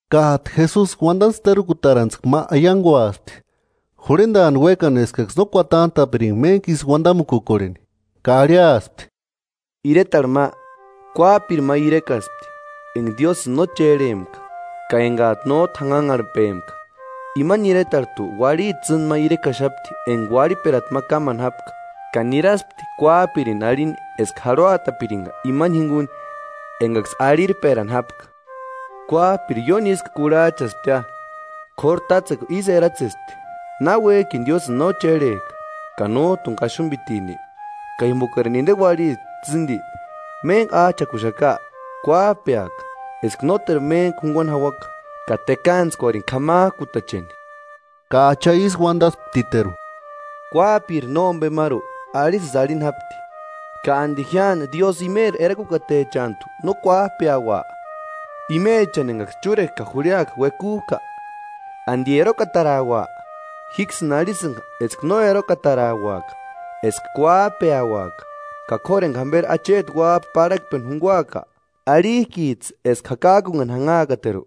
Kájtu Jesusi uandantskua terukutarantskua ma aianguaspti; jurhendaani uékani eskaksï no kuatantaparini méntku ísï uandamukukorheni. Ka arhiaspti: “Iretarhu ma, kuájpiri ma irekaspti enga Diósïni no chérhempka ka enga nójtu janhanharhpempka. Imani iretarhujtu uarhiti tsîndi ma irekaxapti enga arhirperata ma kámani jápka, ka niraspti kuájpiri arhini eska jarhuatapiringa imani jinguni engaksï arhirperani jápka. Kuájpiri ióni ísku kurhajchasptia, kóru tátsekua ísï eratsespti: ‘Na uéjkini Diósïni no chérhejka ka nójtuni kaxumbitini, ka jimbokarini inde uarhiti tsîndi méntku ájchakuxaka, kuájpeaka, eska nóteru méntku junguani jauaka ka tekantskuarini k'amajkutacheni.’” Ka Acha ísï uandasptiteru: “Kuájpiri nómbemaru arisïsï arhini jápti. ¿Ka andi jíani Diósï imeri erakukatechantu no kuajpeaua, imechani engaksï chúrekua ka jurhiakua uekujka? ¿Andi erokataraua? Jíksïni arhisïnga eska no erokatarauaka, eska kuájpeauaka. Ka k'óru enga jamberi acheti Uájpa parhakpeni junguaaka ¿Arhijkijtsï eska jakajkunhani janhaakateru?”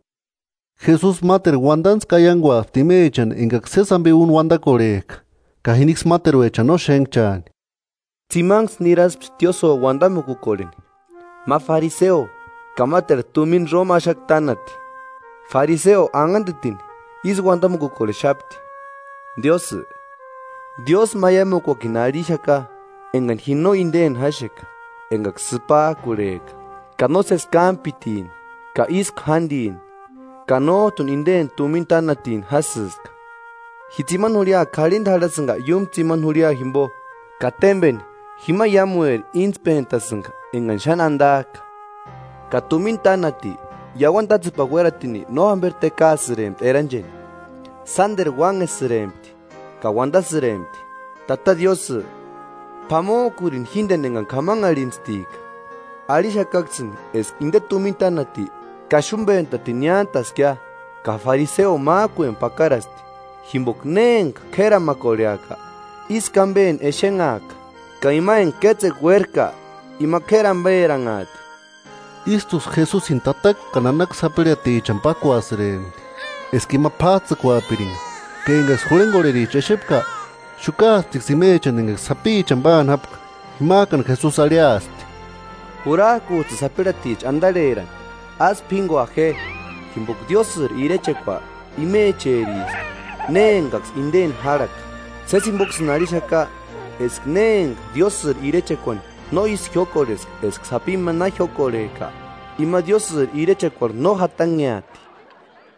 Jesusi máteru uandantskua aianguaspti imechani engaksï sési ambe úni uandakorhejka ka jiniksï máteruechani no xénhchaani: “Tsimanksï niraspti tiósïo uandamukukorheni, ma fariseo, ka máteru tumina Roma axakua tánati. Fariseo, anhandetini, ísï uandamukukorhexapti: ‘Diósï, diósmaiamukuakini arhixaka engani ji no indeni jáxeka, engaksï sïpajkurheka, ka nósesi kámpitini, ka ísku jándini, ka nójtuni inde tumina tánatini jásïska. Ji tsimani jurhia k'arhinda jarhasïnga iúmu tsimani jurhia jimbo ka témbeni jima iámueri íntspentasïnga engani xáni andajka.’ Ka tumina tánati iauani tátsepani uératini no jamberi tekaasïrempti erancheni, sánderu uánhesïrempti, ka uandasïrempti: ‘¡Tata Diósï, p'amojkurini jíndeni engani k'amanharhintstika!’ Arhixakaksïni eska inde tumina tánati kaxumbentatini niántaskia, ka fariseo májkueni pakarasti. Jimboka ne enga k'éramakorheaka, ísku ambeni exenhaaka; ka ima enga kétsekua uérajka, ima k'éri amberanhaati.” Ístuksï Jesusini tataka ka nanaka sapirhatichani pákuasïrempti, eska ima p'ájtsïkuapiringa; ka engaksï jurhengorhericha exepka, xukaasptiksï imechani engaksï sapichani páani jápka. Jimajkani Jesusi arhiaspti: “Jurajkujtsïni sapirhaticha andarherani, ásï p'íngua je, jimboka Diósïri irechekua imecheriska ne engaksï indeni járhaka. Sési jimboksïni arhixaka eska ne enga Diósïri irechekuani no ísï jiókorhejka eska sapi ma na jiókorhejka ima Diósïri irechekuarhu no jatanheati.”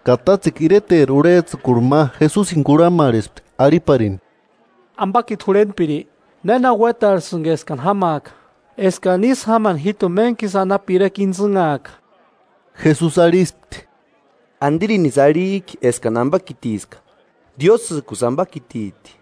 Ka tátsekua ireteri urhejtsïkuri ma Jesusini kurhamarhespti arhiparini: “Ambakiti jurhentpiri ¿Néna uétarhesïnki eskani jámaaka, eskani ísï jámani jíjtuni méntkisï anapu irekua intsïnhaaka?” Jesusi arhispti: “¿Andirinisï arhijki eskani ambakitiska? Diósïjkusï ambakititi.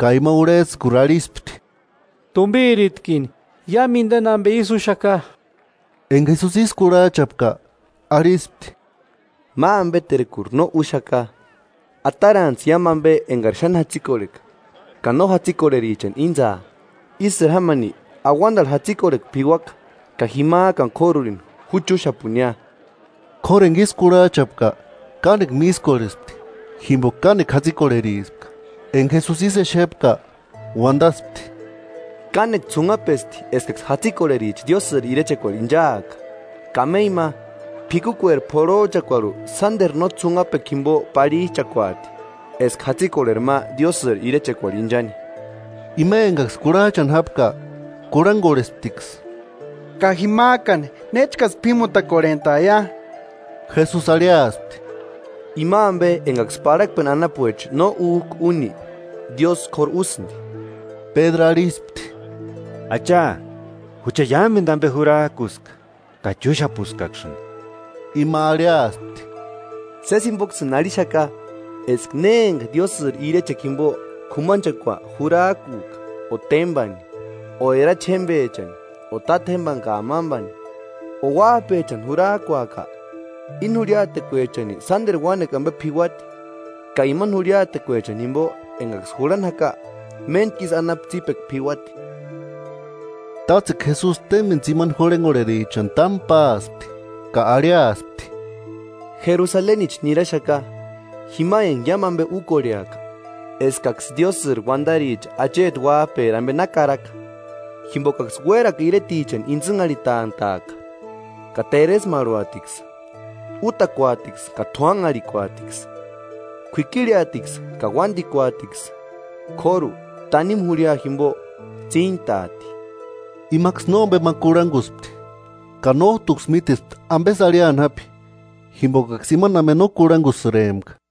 Ka ima urhejtsïkuri arhispti: “Tumbirinitkini iámu indeni ambe ísï úxaka.” Enga Jesusi ísï kurhajchapka, arhispti: “Ma ambeterkuri no úxaka: Atarantsï iámu ambe engari xáni jatsikorheka ka no jatsikorherichani íntsaa. Ísïri jámani auandarhu jatsikorhekua p'iuaka. Ka jimajkani k'órurini ju chúxapunia.” K'óru enga ísï kurhajchapka, kánekua mískorhespti, jimboka kánekua jatsikorherispka. Enga Jesusi ísï exepka, uandaspti: “¡Kánekua ts'unhapesti eskaksï jatsikorhericha Diósïri irechekuarhu inchaaka! Kameiu ma, p'ikukueri p'orhojchakuarhu sánderu no ts'unhapekua jimbo parhijchakuaati, eska jatsikorheri ma Diósïri irechekuarhu inchani.” Ima engaksï kurhajchani jápka, kurhangorhesptiksï: “¿Ka jimajkani néchkasï p'ímutakorhentaia?” Jesusi arhiaspti: “Ima ambe engaksï parhakpeni anapuecha no újka úni, Diósï k'óru úsïndi.” Pédru arhispti: “Acha, jucha iámendu ambe jurajkuska, ka chúxapuskaksïni.” Ima arhiaspti: “Sési jimboksïni arhixaka eska ne enga Diósïri irechekua jimbo k'umanchekua jurajkuka o témbani o erachi jémbechani o tátjembani ka amambani, o uájpechani jurajkuaka, íni jurhiatekuechani sánderu uánekua ambe p'iuati, ka imani jurhiatekuechani jimbo engaksï jurhani jaka méntku ísï anapu tsípekua p'iuati.” Tátsekua Jesusi témbeni tsimani jurhengorherichani támu páaspti, ka arhiaspti: “Jerusalenichi niraxaka, jima enga iámu ambe úkorheaka eskaksï Diósïri uandaricha acheti Uájperi ambe na karaka. Jimbokaksï uérakua iretichani intsïnharhitantaaka, ka teresmarhuatiksï, útakuatiksï ka t'uánharhikuatiksï. K'uikirheatiksï ka uándikuatiksï; k'óru tanimu jurhia jimbo tsíntaati.” Imaksï nómbema kurhanguspti, ka nójtuksï mítespti ambesï arhiani jápi, jimbokaksï imani ambe no kurhangusïrempka.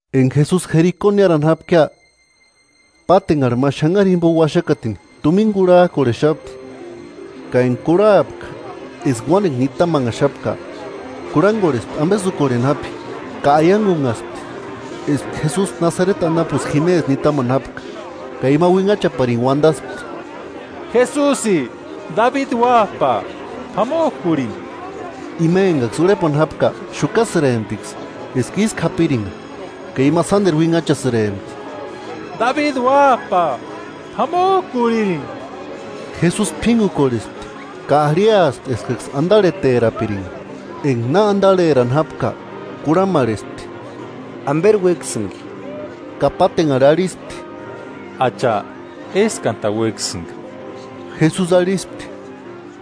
Enga Jesusi Jeriko niárani jápkia, pátenharhi ma xanhari jimbo uaxakatini tumina kurhajkorhexapti, ka enga kurhapka eska uánekua nitamanhaxapka, kurhangorhespti ambesï úkorheni jápi, ka aiangunhaspti eska Jesusi Nasareti anapusï jimesï nitamani jápka, Ka ima uinhachaparini uandaspti: –¡Jesusi, Dabidi Uájpa, p'amojkurini! Ima engaksï urhepani jápka xukasïremptiksï eska ísku japiringa, ka ima sánderu uinhachasïrempti: –¡Dabidi Uájpa, p'amojkurini! Jesusi p'íngukorhespti ka arhiaspti eskaksï andarheterapiringa. Enga na andarherani jápka kurhamarhespti: 41–¿Amberi uéksïnki? Ka pátenharhi arhispti: –Acha, éskantani uéksïnga. Jesusi arhispti: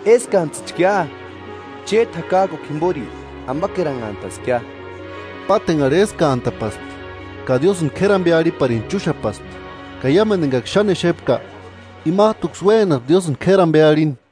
–¡Éskantsïchkia! Chéti jakajkukua jimbori ambakeranhantaskia. Pátenharhi éskantapaspti, ka Diósïni k'éri ambe arhiparini chúxapaspti. Ka iámendu engaksï xáni exepka, imajtuksï uénaspti Diósïni k'éri ambe arhini.